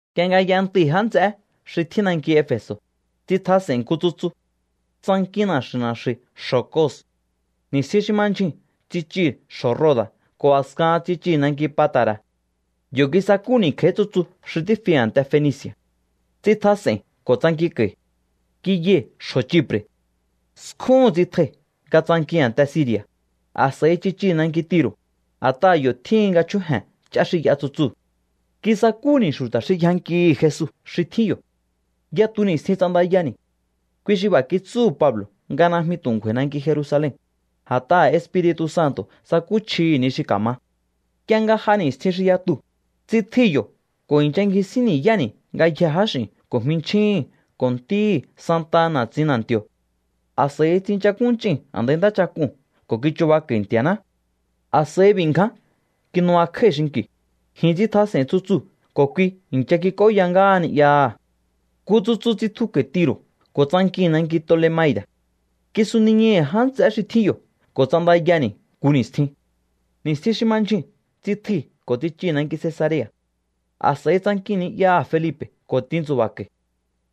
Nk'ie nga y'entui̱ já nts'eé xi tjín nanki Efe̱so̱, tsitjas'e̱i̱n nku tsutsu. Tsankin na̱xu̱i̱ na̱xu̱i̱ xjo̱ Cos. Ni̱stjin xi ma ndyjuu̱n tsichii̱ xjo̱ Roda̱ ko̱ a̱skahan tsichii̱ nanki Pata̱ra̱. Yo̱ kisakúni̱ kj'a̱í tsutsu xi tífi a̱nte Fenici̱a̱. Tsitjas'e̱i̱n ko̱ tsankinko̱i̱. Kiyai̱ xjo̱ Chipre̱. Skjúhu̱n tsitjai̱ nga tsankii̱n a̱nte Siri̱a̱. A̱s'a̱i tsichii̱ nanki Tiro̱, a̱t'aha̱ yo̱ tjíhin nga chjúje̱n ch'á xi y'a tsutsuu̱. Kisakúni̱ xu̱ta̱ xi yjankihi̱ Jesu xi tjín yo̱. Yatu ni̱stjin ts'andayani̱. Kui xi b'a̱ kitsúhu̱ Pablo̱ nga najmi tu̱ ngju̱a̱i̱ nanki Jerusalen, a̱t'aha̱ Espiri̱tu̱ Santo̱ tsakúchjihi̱ ni xi ka̱ma. Nk'ie nga j'a ni̱stjin xi yatuu̱, tsitjui̱ yo̱ ko̱ i̱ncha ngjisín ni̱yáni̱ ngayjee̱ jáx'i̱n ko̱ jminchjíhi̱n ko̱ ntíhi̱ santaha na̱tsin na̱nti̱o̱. A̱s'a̱i tsinchakúnch'ii̱n a̱ndai ntáchak'uu̱n ko̱ kichubako̱i̱ Nti̱a̱ná. A̱s'a̱i b'i̱ ngján kinubakjái̱ xinki̱, ji̱n tsitjas'e̱i̱n tsutsuu̱ ko̱ kui i̱ncha kik'óya ngáha ni'yaha̱. Nku tsutsu tsitjuko̱i̱ Tiro̱ ko̱ tsankii̱n nanki Tolemaida̱. Kisuniñai̱hi̱ já nts'eé xi tjín yo̱ ko̱ ts'andayani̱ nku ni̱stjin. Ni̱stjin xi ma ndyjuu̱n tsitjui̱ ko̱ tsichii̱ nanki Cesarea̱. A̱s'a̱i tsankii̱n ni'yaha̱ Felipe̱ ko̱ tintsu̱ba̱ko̱i̱.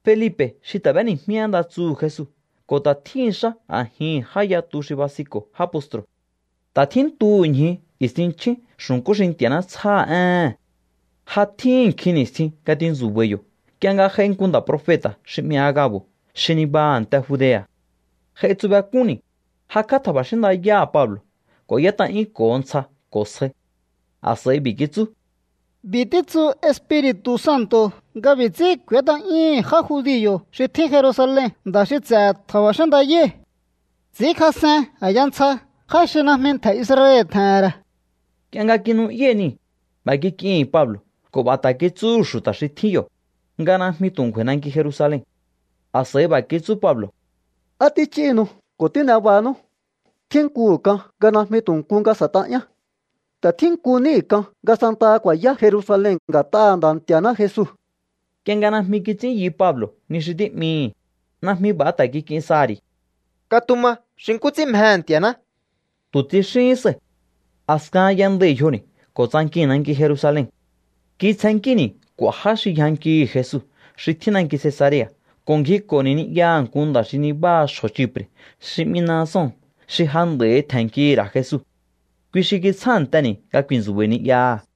Felipe̱ xi ta̱ b'éni̱jmí én nda tsuhu̱ Jesu ko̱ ta̱ tjíhi̱n xá a̱jihi̱n já yatu xi basinko̱ já postru̱. Ta̱ tjíntuhu̱ ñju i̱stinchjín xu̱nkú xi Nti̱a̱ná tsjáha̱ éhe̱n. Ja tjíhi̱n nkjin ni̱stjin nga tintsu̱ba̱i̱ yo̱ nk'ie nga j'ai nku nda̱ profeta̱ xi 'mi Aga̱bo̱ xi nibaha a̱nte Judea̱. J'aitsubek'únni̱, jakj'á tja̱ba̱xín ndayáha̱ Pablo̱ ko̱ y'ét'a'yúnko̱ho ntsja ko̱ sjai. A̱s'a̱i b'i̱ kitsú: —B'i̱ títsu Espiri̱tu̱ Santo̱ nga b'i̱ ts'ín k'u̱ét'a'yúhu̱n já judio̱ xi tjín Jerusalen nda̱ xi ts'e̱ tja̱ba̱xín ndayái̱. Ts'i̱ínkjas'en a̱ya ntsja já xi najmi ntje̱ Israel tje̱he̱n ra̱. Nk'ie nga kinu'yái̱ niu̱, b'a̱ kik'ii̱hi̱n Pablo̱ ko̱ b'a̱ ta̱ kitsúhu̱ xu̱ta̱ xi tjín yo̱, nga najmi tu̱ ngju̱a̱i̱ nanki Jerusalen. A̱s'a̱i b'a̱ kitsú Pablo̱: —¿Á tích'íhinu ko̱ tín'e bahanú? Tjínkuhu̱ k'an nga najmi tu̱ nku nga s'e̱t'a'yán. Ta̱ tjínku níhi̱ k'an nga santaha ku̱a̱yá Jerusalen nga̱t'aha̱ Nda̱ Nti̱a̱ná Jesu. Nk'ie nga najmi kits'ín yu Pablo̱ ni xi tí'mii̱hi̱, najmi b'a̱ ta̱ kik'in saha̱ ri̱. —Katuma xi nkú ts'ín mjehe̱ Nti̱a̱ná —tu̱ tsixíhín sai̱. A̱skahan y'endai̱ yjoni̱ ko̱ tsankii̱n nanki Jerusalen. Kitsjennkíni̱ k'u̱a̱ já xi yjankihi̱ Jesu xi tjín nanki Cesarea̱ ko̱ ngjiko̱ni̱ ni'yaha̱ nku nda̱ xi nibáha xjo̱ Chipre̱ xi 'mi Mnason xi ja nd'a̱i tje̱nnkihi̱ ra̱ Jesu. Kui xi kitsjánteni̱ nga ku̱i̱ntsu̱ba̱i̱ ni'yaha̱.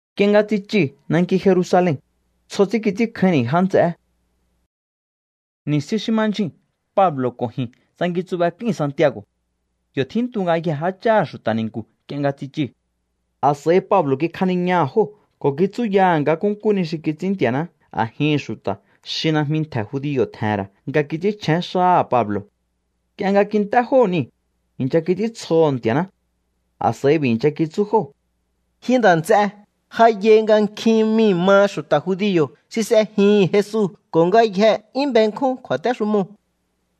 Nk'ie nga tsichii̱ nanki Jerusalen, tsjo ts'ín kits'ínkjáínni̱ já nts'eé. Ni̱stjin xi ma ndyjuu̱n Pablo̱ ko̱ ji̱n tsankintsubek'ui̱n Santiago̱. Yo̱ tjíntu ngayjee̱ jácháha̱ xu̱ta̱ ni̱nku̱ nk'ie nga tsichii̱. A̱s'a̱i Pablo̱ kikjaniñaha̱ jóo̱ ko̱ kitsúyaha̱ nga nkúnkú ni xi kits'ín Nti̱a̱ná a̱jihi̱n xu̱ta̱ xi najmi ntje̱ judio̱ tje̱he̱n ra̱ nga kits'ínchjén xáha̱ Pablo̱. Nk'ie nga kint'é jóo̱ niu̱, i̱ncha kits'íntsjoho̱ Nti̱a̱ná. A̱s'a̱i b'i̱ i̱ncha kitsú jóo̱: —Ji nda̱ nts'e, ja yai nga nkjin mii̱ maha xu̱ta̱ judio̱ xi s'ejihi̱n Jesu ko̱ ngayjee̱ 'yún benkjún kju̱a̱téxumoo̱.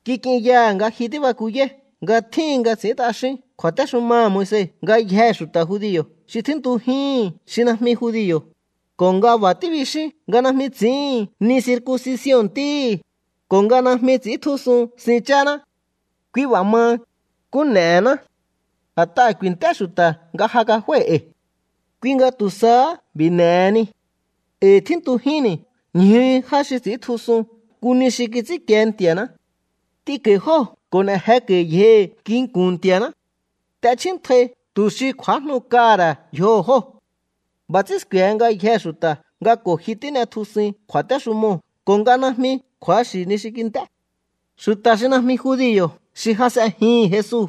Kik'inyaha̱ nga ji tíbakuyáí nga tjíhin nga ts'i̱ín t'axín kju̱a̱téxumaha̱ Moise ngayjee̱ xu̱ta̱ judio̱ xi tjíntujíhi̱n xi najmi judio̱, ko̱ nga b'a̱ tíbixín nga najmi ts'i̱íhi̱n ni circuncision ntíhi̱, ko̱ nga najmi ts'i̱íntjusun sin cháná. ’Kui b'a̱ maha, ¿nkú n'e̱hená? A̱t'aha̱ ku̱i̱nt'é xu̱ta̱ nga ja kaf'ái̱ e̱i̱. Kui nga tu̱ sahá b'i̱ n'e̱heni. E̱i̱ tjíntujínni̱ ñju já xi ts'i̱íntjusun nku ni xi kits'ínkie Nti̱a̱ná. T'inko̱i̱ jóo̱ ko̱ n'e̱ jeko̱i̱ yjohi̱ nginku̱n Nti̱a̱ná. T'echjíntjai tu̱ xi kj'u̱ájnu kaha̱ ra̱ yjoho̱ jóo̱. B'a̱ ts'ín sku̱e̱he ngayjee̱ xu̱ta̱ nga ko̱ ji tín'etjusuin kju̱a̱téxumoo̱ ko̱ nga najmi kju̱axi̱ ni xi kint'é. ’Xu̱ta̱ xi najmi judio̱ xi ja s'ejihi̱n Jesu,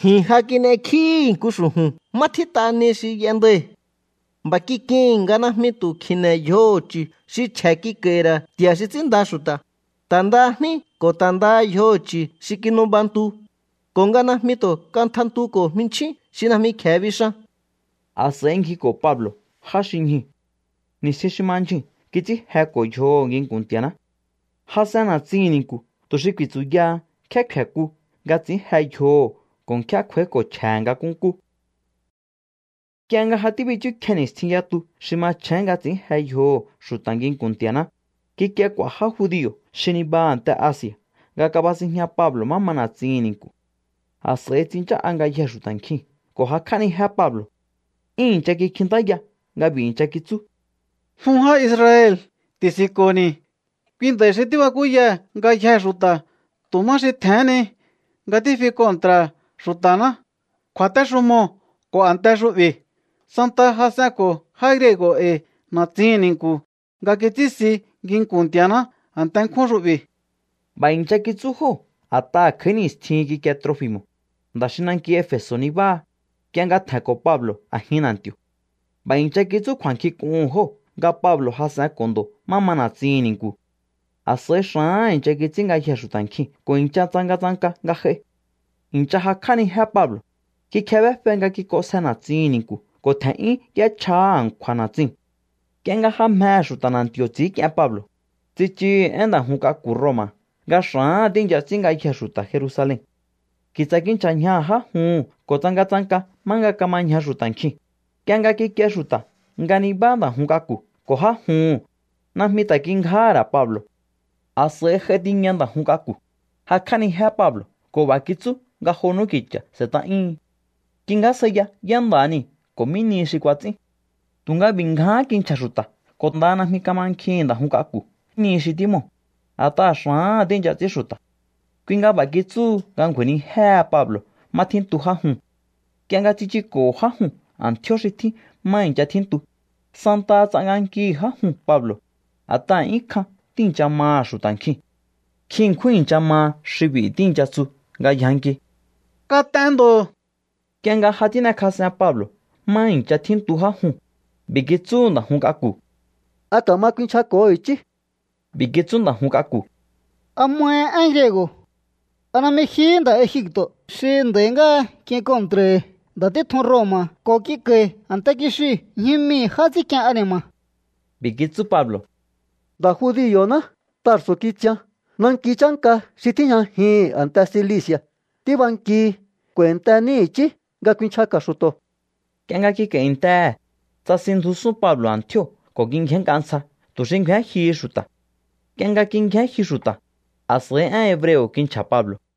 ji̱n ja kin'ekjíi̱hi̱ nku xu̱ju̱n má tjít'a ni xi y'endai̱. B'a̱ kik'ii̱hi̱n nga najmi tu̱ kji̱ne̱ yjoho̱ chu̱ xi chje̱ kik'a̱i̱hi̱ ra̱ nti̱a̱ xi ts'ínnda xu̱ta̱, ta̱ ndaha jní ko̱ ta̱ ndaha yjoho̱ chu̱ xi kinubantu, ko̱ nga najmi tu̱ katjantuko̱ jminchín xi najmi kje̱e bixan. A̱s'a̱i ngjiko̱ Pablo̱ já xi ñjuu̱. Ni̱stjin xi ma ndyjuu̱n kits'ín jeko̱ yjoho̱ nginku̱n Nti̱a̱ná. Jas'en na̱tsihi̱n ni̱nku̱ tu̱ xi ku̱i̱tsu̱yaha nkjé kfe̱ku nga ts'i̱ín je yjoho̱ ko̱ nkjé kj'u̱a̱íko̱ chje̱he̱ nga nkúnkú. Nk'ie nga ja tíbichúkje ni̱stjin yatu xi machjén nga ts'ín je yjoho̱ xu̱ta̱ nginku̱n Nti̱a̱ná, kikie k'u̱a̱ já judio̱ xi nibaha a̱nte Asi̱a̱ nga kabasinjña Pablo̱ má ma na̱tsihi̱n ni̱nku̱. A̱s'a̱i tsinchá'a ngayjee̱ xu̱ta̱ nkjiu̱n ko̱ jakj'ánijé Pablo̱. 'Yún i̱ncha kikjintáya nga b'i̱ i̱ncha kitsú: —¡Jun já Israel, ti̱si̱nko̱ni̱! Kui nda̱i̱ xi tíbakúyaha̱ ngayjee̱ xu̱ta̱ tu̱ má xi tje̱hén ni nga tífi kontra̱ha̱ xu̱ta̱ná, kju̱a̱téxumoo̱ ko̱ a̱nte xu'bi̱. Santaha jas'enko̱ já griego̱ e̱i̱ na̱tsihi̱n ni̱nku̱ nga kits'ínsi nginku̱n Nti̱a̱ná a̱nte nkjún xu'bi̱. B'a̱ i̱ncha kitsú jóo̱ a̱t'aha̱ kj'a̱í ni̱stjihin kikie Trofi̱mo̱, nda̱ xi nanki Efe̱so̱ nibáha, nk'ie nga tje̱nko̱ Pablo̱ a̱jin na̱nti̱o̱. B'a̱ i̱ncha kitsú kju̱a̱nkjink'uhu̱n jóo̱ nga Pablo̱ jas'enko̱ ndo̱ má ma na̱tsihi̱n ni̱nku̱. A̱s'a̱i xa̱áha̱n i̱ncha kits'ín ngayjee̱ xu̱ta̱ nkjiu̱n ko̱ i̱ncha tsangatsanka nga j'ai. I̱ncha jakj'ánijé Pablo̱, kikjebéfe nga kik'onsje na̱tsin ni̱nku̱ ko̱ tje̱n'yún y'échjahá a̱nkju̱a̱ na̱tsiu̱n. Nk'ie nga ja mjehe̱ xu̱ta̱ na̱nti̱o̱ ts'i̱ínk'ien Pablo̱, tsichuhu̱ én nda̱ jun k'aku̱ Roma̱ nga xa̱áha̱n tíi̱ncha ts'ín ngayjee̱ xu̱ta̱ Jerusalen. Ki̱tsa̱ kinchja̱ ñjaha̱ já juhu̱n ko̱ tsangatsanka má nga kama ñja xu̱ta̱ nkjiu̱n. Nk'ie nga kikie xu̱ta̱ nga nibá nda̱ jun k'aku̱ ko̱ já juhu̱n, najmi ta̱ kingjáha̱ ra̱ Pablo̱. A̱s'a̱i j'ai tiña nda̱ jun k'aku̱, jakj'ánijé Pablo̱ ko̱ b'a̱ kitsú nga jo n'úki̱cha̱ s'e̱t'a'yúhun. Kingjásjaiya yá nda̱ha niu̱ ko̱ mí nihi xi kuats'ín. Tu̱nga b'i̱ ngjáhán kinchja̱ xu̱ta̱ ko̱ ndaha najmi kamankjihi̱n nda̱ jun k'aku̱ ni xi tímoo̱, a̱t'aha̱ xa̱áha̱n tíi̱ncha ts'ín xu̱ta̱. Kui nga b'a̱ kitsúhu nga ngju̱a̱i̱nijéhe Pablo̱ má tjíntu já juu̱n. Nk'ie nga tsichuko̱ho̱ já juu̱n a̱ntjío̱ xi tjín má i̱ncha tjíntu, santaha ts'agankihi̱ já juu̱n Pablo̱, a̱t'aha̱ 'yún kjan tíi̱ncha maha̱ xu̱ta̱ nkjiu̱n. Nkjin ṉkjún i̱ncha maha xi b'i̱ tíi̱ncha tsu nga yjanki: —¡Kat'en ndo̱! Nk'ie nga ja tín'ekjas'en Pablo̱ má i̱ncha tjíntu já juu̱n, b'i̱ kitsúhu̱ nda̱ jun k'aku̱: —¿A ka̱ma kuinchjako̱ho i̱chí? B'i̱ kitsú nda̱ jun k'aku̱: —¿A mahi én griego̱? ¿A najmi jihí nda̱ Egipto̱ xi nd'a̱i̱ ngáha k'in kontra̱i̱hi̱ nda̱ títjun Roma̱ ko̱ k'inko̱i̱ a̱nte kixiu̱ ñju mii̱ já ts'ínk'ien ani̱ma̱? B'i̱ kitsú Pablo̱: —Nda̱ judio̱ná. Tarso̱ kitsian, nanki chánka xi tíjñajihi̱n a̱nte Cilici̱a̱. Tíbankihi. K'u̱a̱i̱ntení i̱chí nga kuinchjaka̱ xu̱to̱. Nk'ie nga kik'a̱i̱ntehe̱, tsasinndjusún Pablo̱ a̱ntjío̱ ko̱ kingjénnk'a ntsja tu̱ xi ngju̱én jyuhu xu̱ta̱. Nk'ie nga kingjén jyu xu̱ta̱, a̱s'a̱i én hebreo̱ kinchja̱ Pablo̱.